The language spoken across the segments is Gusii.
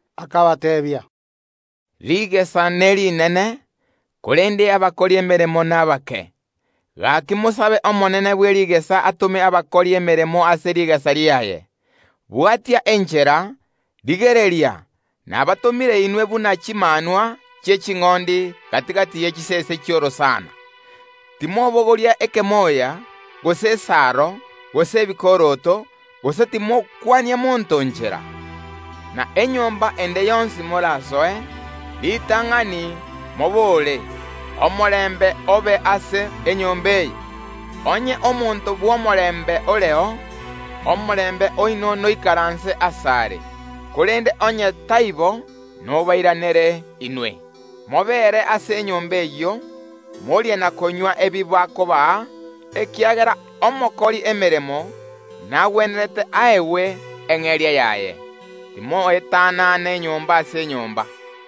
Akabateebia, “Rigesa nerinene, korende abakori emeremo nabake; gaki mosabe Omonene bwe rigesa atome abakori emeremo ase rigesa riaye. Bwatia enchera; rigereria, nabatomire inwe buna chimanwa chi’eching’ondi gati‐gati ye chisese chi’orosana. Timobogoria ekemoya, gose esaro, gose ebikoroto; gose timokwania monto nchera. Na enyomba ende yonsi morasoe, ritang’ani mobore: Omorembe obe ase enyomba eye. Onye omonto bw’omorembe oreo, omorembe oino noikaranse asare; korende onye taibo, nobairanere inwe. Mobeere ase enyomba eyio, morie na konywa ebi bakobaa, ekiagera omokori emeremo nagwenerete aegwe eng’eria yaye. Timoetanana enyomba ase enyomba.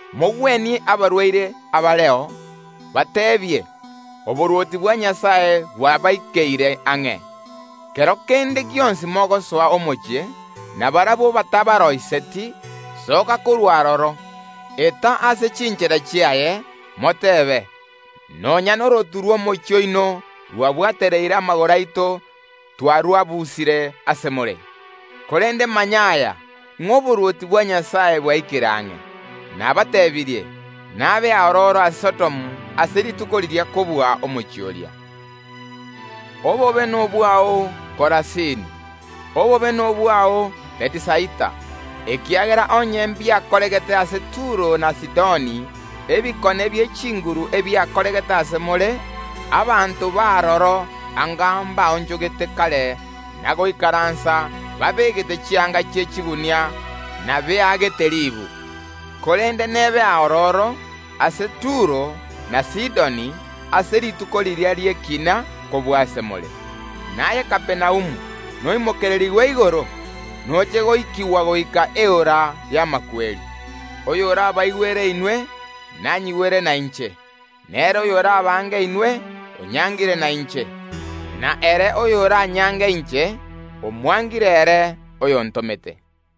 Mogwenie abarwaire abareo, mobateebie: Oborwoti bwa Nyasae bwabaikeire ang’e. Kero kende gionsi mogosoa omochie, na barabwo batabaariganeti, soka korwa aroro, eta ase chinchera chiaye, motebe: Nonya norotu rw’omochie oino rwabwatereire amagoro aito twarwabusire ase more, korende manya aya, ng’a oborwoti bwa Nyasae bwaikire ang’e. Nabateebirie, nabe aororo ase Sodomu ase rituko riria kobua omochie oria.” “Obobe nobwao, Korasini! Obobe nobwao, Bethisaida! Ekiagera onye mbiakoregete ase Turo na Sidoni ebikone bie chinguru ebiakoregete ase more, abanto b’aroro anga mbaonchogete kare na goikaransa babegete chianga chi’echigunia na beagete ribu. Korende nebe aororo ase Turo na Sidoni ase rituko riria ri’ekiina kobua ase more. Naye Kapernaumu, noimokererigwe igoro? Noche goikigwa goika Eora y’amakweri. “Oyorabaigwere inwe, nanyigwere nainche, na ere oyorabaange inwe, onyangire nainche, na ere oyoranyange inche, omwangire ere oyontomete.”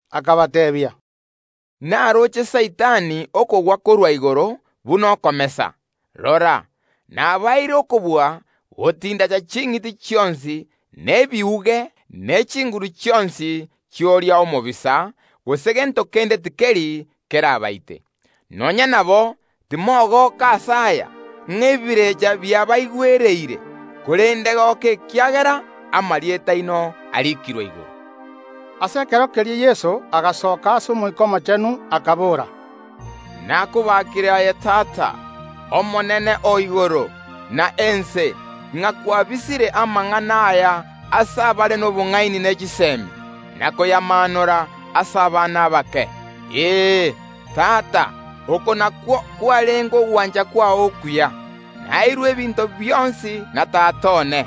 Akabateebia, “Naroche Saitani okogwa korwa igoro buna okomesa. Rora, nabaeire okobua gotindacha ching’iti chionsi, na ebiuge, ne chinguru chionsi chi’oria omobisa; gose gento kende tikeri kerabaite. Nonya nabo timogoka ase aya, ng’a ebirecha biabaigwereire, korende goka ekiagera amarieta aino arikirwe igoro.” Ase ekero keria Yeso agasasoka ase Omoika Omochenu, akabora, “Nakobakire aye Tata, Omonene o igoro na ense, ng’a kwabisire amang’ana aya ase abare nobong’aini ne chisemi, na koyamaanora ase abana abake. Ee, Tata, oko nakwo kwarenge ogwancha kwao okuya. Naeirwe ebinto bionsi na Tata one;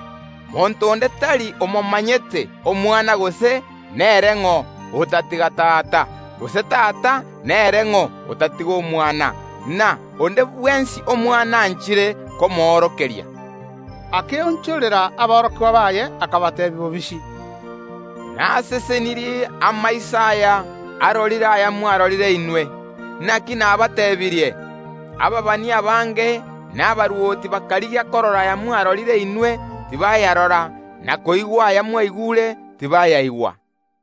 monto onde tari omomanyete Omwana gose nere ng’o, otatiga Tata, gose Tata nere ng’o, otatiga Omwana, na onde bwensi Omwana anchire komoorokeria.” Akaonchokera aborokigwa baye, akabateebia bobisi, “Nasesenirie amaiso aya arorire ayamwarorire inwe! Naki nabateebirie, ababani abange na abarwoti bakarigia korora ayamwarorire inwe, tibayarora, na koigwa aya mwaigure, tibayaigwa.”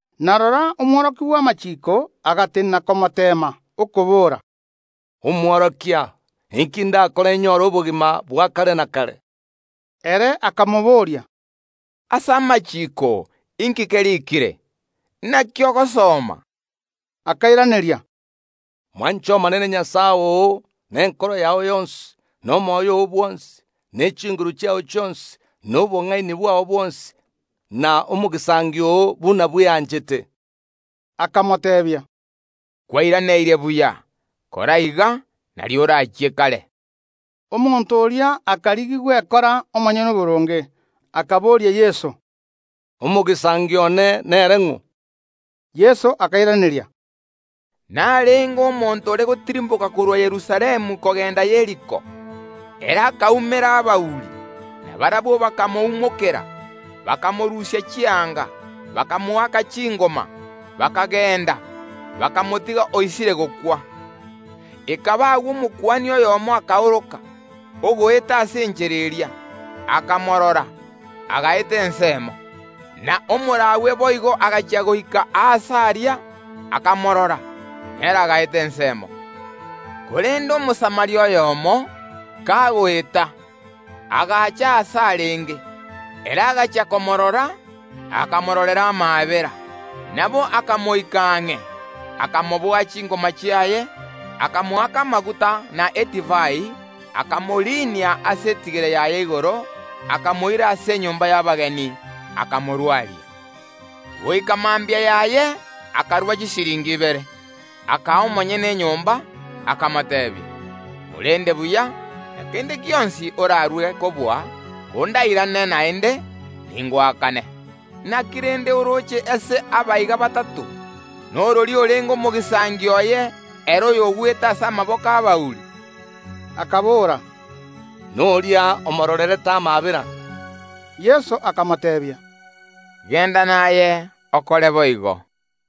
Na rora, omworokia bw’amachiiko agatenena okomoteema, okobora, “Omworokia, inki ndakore nyore obogima bwa kare na kare?” Ere akamobooria, “Ase amachiiko inki keriikire? Naki ogosoma?” Akairaneria, “Mwanche Omonene Nyasae oo nenkoro yao yonsi, na omoyo oo bwonsi, ne chinguru chiao chionsi, na obong’aini bwao bwonsi, na omogisangio oo buna bweanchete.” Akamoteebia, “Kwairaneirie buya. Kora iga, nario oramenye amatuko amange.” Omonto oria akarigia gwekora omonyene oboronge, akaboria Yeso, “Omogisangio one nere ng’o?” Yeso akairaneria, “Narenge omonto ore gotirimboka korwa Yerusalemu kogenda Yeriko. Ere akaumera abauri, na barabwo bakamoumokera, bakamorusia chianga, bakamoaka chingoma, bakagenda, bakamotiga oisire gokwa. Ekaba agwo Omokuani oyomo akaoroka, ogoeta ase enchera eria, akamorora, agaeta ensemo. Na Omolawi boigo agachia goika aase aria, akamorora; nere agaeta ensemo. Korende Omosamaria oyomo, kagoeta, agacha aase arenge; ere agachia komoorora, akamororera amaabera. Nabo akamoika ang’e, akamoboa chingoma chiaye, akamoaka amaguta na edivai; akamoriinia ase etigere yaye igoro, akamoira ase enyomba y’abageni, akamorwaria. Goika mambia yaye akarua chisiringi ibere, akaa omonyene enyomba, akamoteebia: Morende buya; na kende gionsi orarue kobua, kondairane naende, ningoakane. Naki rende orooche ase aba iga batato, norori orenge omoamate oye ere oyogwete ase amaboko y’abauri?” Akabora, “Noria omoororerete amaabera.” Yeso akamoteebia, “Genda naye okore boigo.”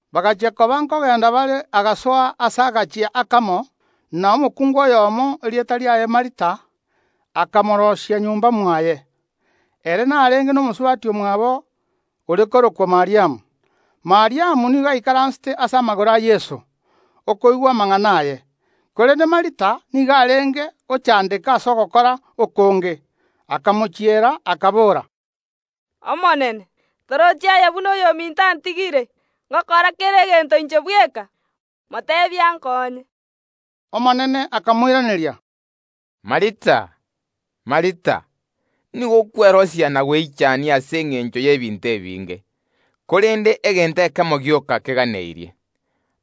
Ekero bare kogenda orogendo rwabo, agasoa ase agachie akamo, na omokungu oyomo, erieta riaye Martha, akamoarigania nyomba mwaye. Ere narenge nomosubati omwabo ore korokwa Mariamu oyio oikaransete ase amagoro a Yeso, koigwa amang’ana aye. Korende Martha nigo arenge gochandeka ase ogokora okonge, akamochiera, akabora, “Omonene, torochi aye buna oyominto antigire ngokora kera egento inche bweka? Moteebie ankonye.” Omonene akamoiraneria, “Martha, Martha, nigo okwerosia na gweichania ase engencho y’ebinto ebinge, korende egento ekemo gioka keganeirie.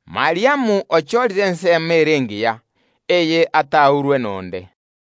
Mariamu ochorire ensemo ere engiya, eye ataurwe nonde.”